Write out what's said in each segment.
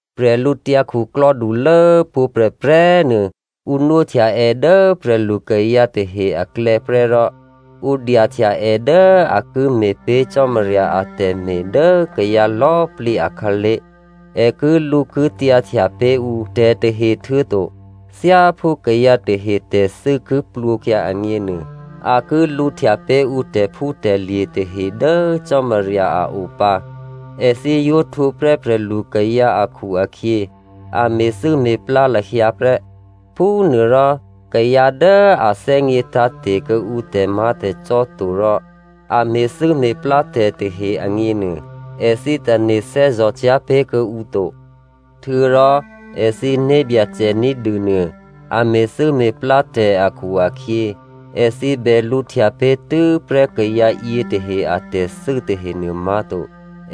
Bwídukhulố pwǒ̤꤮ prè̤prè̤꤮ nuô, ǔ nwóhtya è dố prè̤lukayǎ tahe aklè̌ prè́ rò ǔ dyahtya è dố a ki me̤pé̤ Cò́marya atè̤me̤ dố kayǎ lò̌꤮ plǐ akhǎlé̤. È kilǔkityǎhtya pé̤ ǔ tè̤tahe, htuô̌to thyáphú kayǎ tahe tè̤thû́ ki plwǒkyǎ agněnuô, a ki lǔhtya pé̤ ǔ tè̤phútè̤lye̤ tahe dố Cò́marya a o pǎ. Èthǐ yǒ htwǒprè́ prè̤lukayǎ akhu-akhyě, a me̤thû́me̤plá lahyǎ prè́. Phúnuôrò kayǎ dố a thè́gně tǎ̤te̤ kuô̌ǔ tè̤má̤tè̤cò́ to rò a me̤thû́me̤plá tè̤ tahe agněnuô, èthǐ tane̤ thè́zò̤cyá̤ pé̤kuô̌ǔ to. Htuô̌rò èthǐ né̤byacè ní̤dû nuô, a me̤thû́me̤plá tè̤ akhu-akhyě, èthǐ bè lǔhtya pé̤ tû́prè́ kayǎ yětahe atè̤thû́ tahenuô má̤to,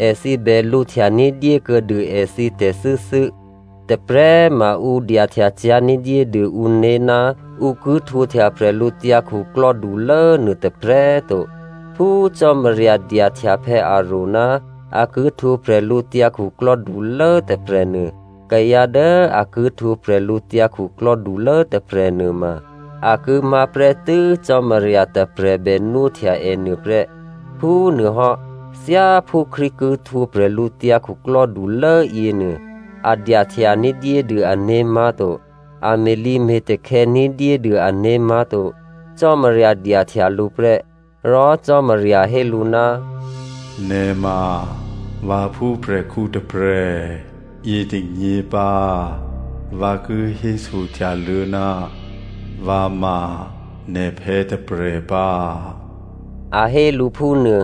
èthǐ bè lǔhtya ní̤dyé kuô̌dû èthǐ tè̤thû́thû́. Tôprè̤꤮ ma ǔ dyahtyacyá̤ ní̤dyédû ǔné̤ ná ǔ ki htwǒhtya bwídukhulố nuô tôprè̤꤮ to. Phú Cò́marya dyahtya Aròn ná a ki htwǒ bwídukhulố tôprè̤nuô, kayǎ dố a ki htwǒ bwídukhulố tôprè̤ nuôma, a ki má̤ prè́tû́ Cò́marya tôprè̤ bè nwóhtya è nuôprè́. Phúnuôhò́, thyáphú Krístu ki htwǒ bwídukhulố yěnuô, a dyahtya ní̤dyédû ané̤ má̤to, a me̤lǐme̤takhè̌ ní̤dyédû ané̤ má̤to, Cò́marya dyahtya lǔ prè́. Rò Cò́marya hé lǔ, “Nè̤ ma vǎphúkhǔ, yětônyěrò, vǎ htwǒ hò́ nè̤phè̌ hò́,” a hé lǔ phúnuô.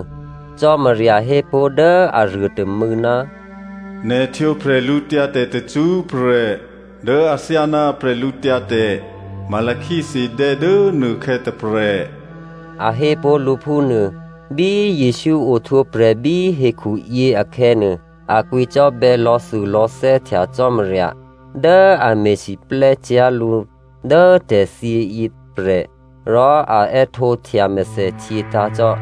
Cò́marya hépó̤ dố aruô tômû̌, “Nè̤ htwǒ bwídu tacṳ́prè̤ dố athyáná bwídu Melchizedè dố nuôkhè̌ tôprè̤,” a hé pó̤ lǔ phúnuô. Bí Jesǔ ohtwǒprè̤ bí hekhuyě akhè̌nuô, a kwǐcò́bè̌ lò̌thulò̌thè́ htya Cò́marya dố a me̤siplè́cyá̤ lǔ dố tè̤thyěyě tôprè̤, rò a è́htǒhtya mèthèhtyě tǎ̤ cò́.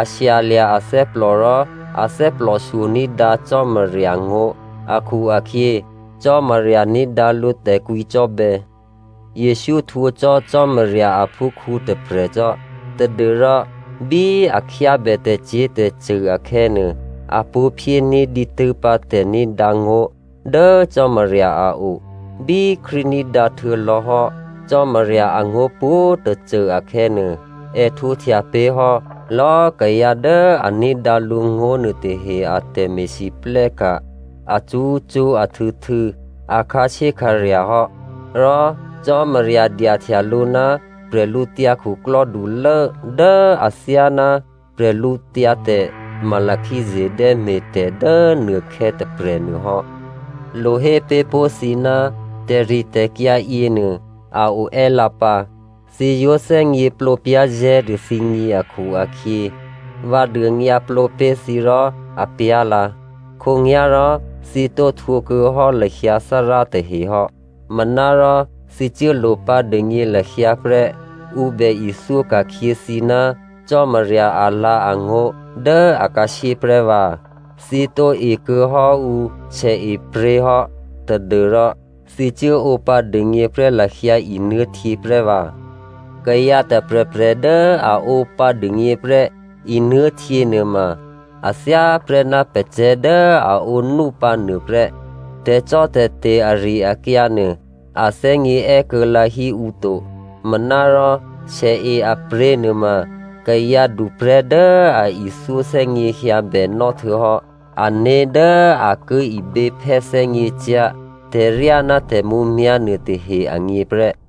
A shyalya̤ athè́plò rò a thè́plòshyo ní̤dǎ Cò́marya ngó̤ akhu-akhyě, Cò́marya ní̤dǎ lǔ tè̤kwǐcò́bè̌. Jesǔ htwǒ cò́ Cò́marya aphúkhǔ tôprè̤ cò́ tadû́rò bí a khyábè tè̤cyě̤tè̤cṳ̂ akhè̌nuô, a pṳ̌ phyéní̤ dǐtû́pǎ tè̤ní̤dǎ ngó̤ dố Cò́marya a o. Bí Krístu ní̤dǎ htuô̌lò̌hò́ Cò́marya angó̤ pwǒ̤꤮ tôcô akhè̌nuô, è htwǒhtya pé̤hò́ lò̌꤮ kayǎ dố a ní̤dǎ lǔngó̤ nuôtahe a tè̤me̤lwóhteka̤ acṳ́cṳ́ ahtû̌htû̌ a khǎshyékhǎrya̤ hò́. Rò Cò́marya dyahtya lǔ ná bwídukhulố dố athyáná bwídu Melchizedè me̤tè̤ dố nuôkhè̌ tôprè̤ nuôhò́. Lo hé pé̤ pó̤ thǐ ná tè̤ritè̤kyǎ yěnuô a o è́lǎ pǎ. Thǐ yǒ thè́gněplǒ pyá̤zè̤́ dû thǐgně akhu-akhyě, vǎ dônyǎplǒ pé̤ thǐ rò apyá̤lǎ. Khǒnyá̤rò thǐ tǒ htwǒkuô̌hò́ lahyǎ Thárá tahehò́. Manárò thǐ cuố lopǎ dûgně lahyǎ prè́ ǔ bè ithyó ka̤khyě thǐ ná Cò́marya alǎ̤angó̤ dố akhǎshyé prè́vǎ. Thǐ tǒ ekuô̌ hò́ ǔ sèepryě̤ hò́ tadû́rò thǐ cuố ǒpǎ dûgně prè́ lahyǎ nuô̤htyě prè́vǎ. Kayǎ tôprè̤prè̤ dố a ǒpǎ dûgněprè́ nuô̤htyě nuôma a thyáprè́ ná pacè̤̌ dố a ǒnúpǎ nuôprè́. Tè̤cò́tè̤te̤ ari-akyǎ nuô, a thè́gně è́kuô̌lǎ hí ǔ to. Manárò, sèe a pryě̤ nuôma kayǎ duprè̤́ dố a ithyó thè́gněhyǎ bènò́ htuô̌hò́ ané̤ dố a ki iběphè́ thè́gněcyá̤ tè̤ryá ná tè̤mǔmyá̤ nuôtahe agně prè́.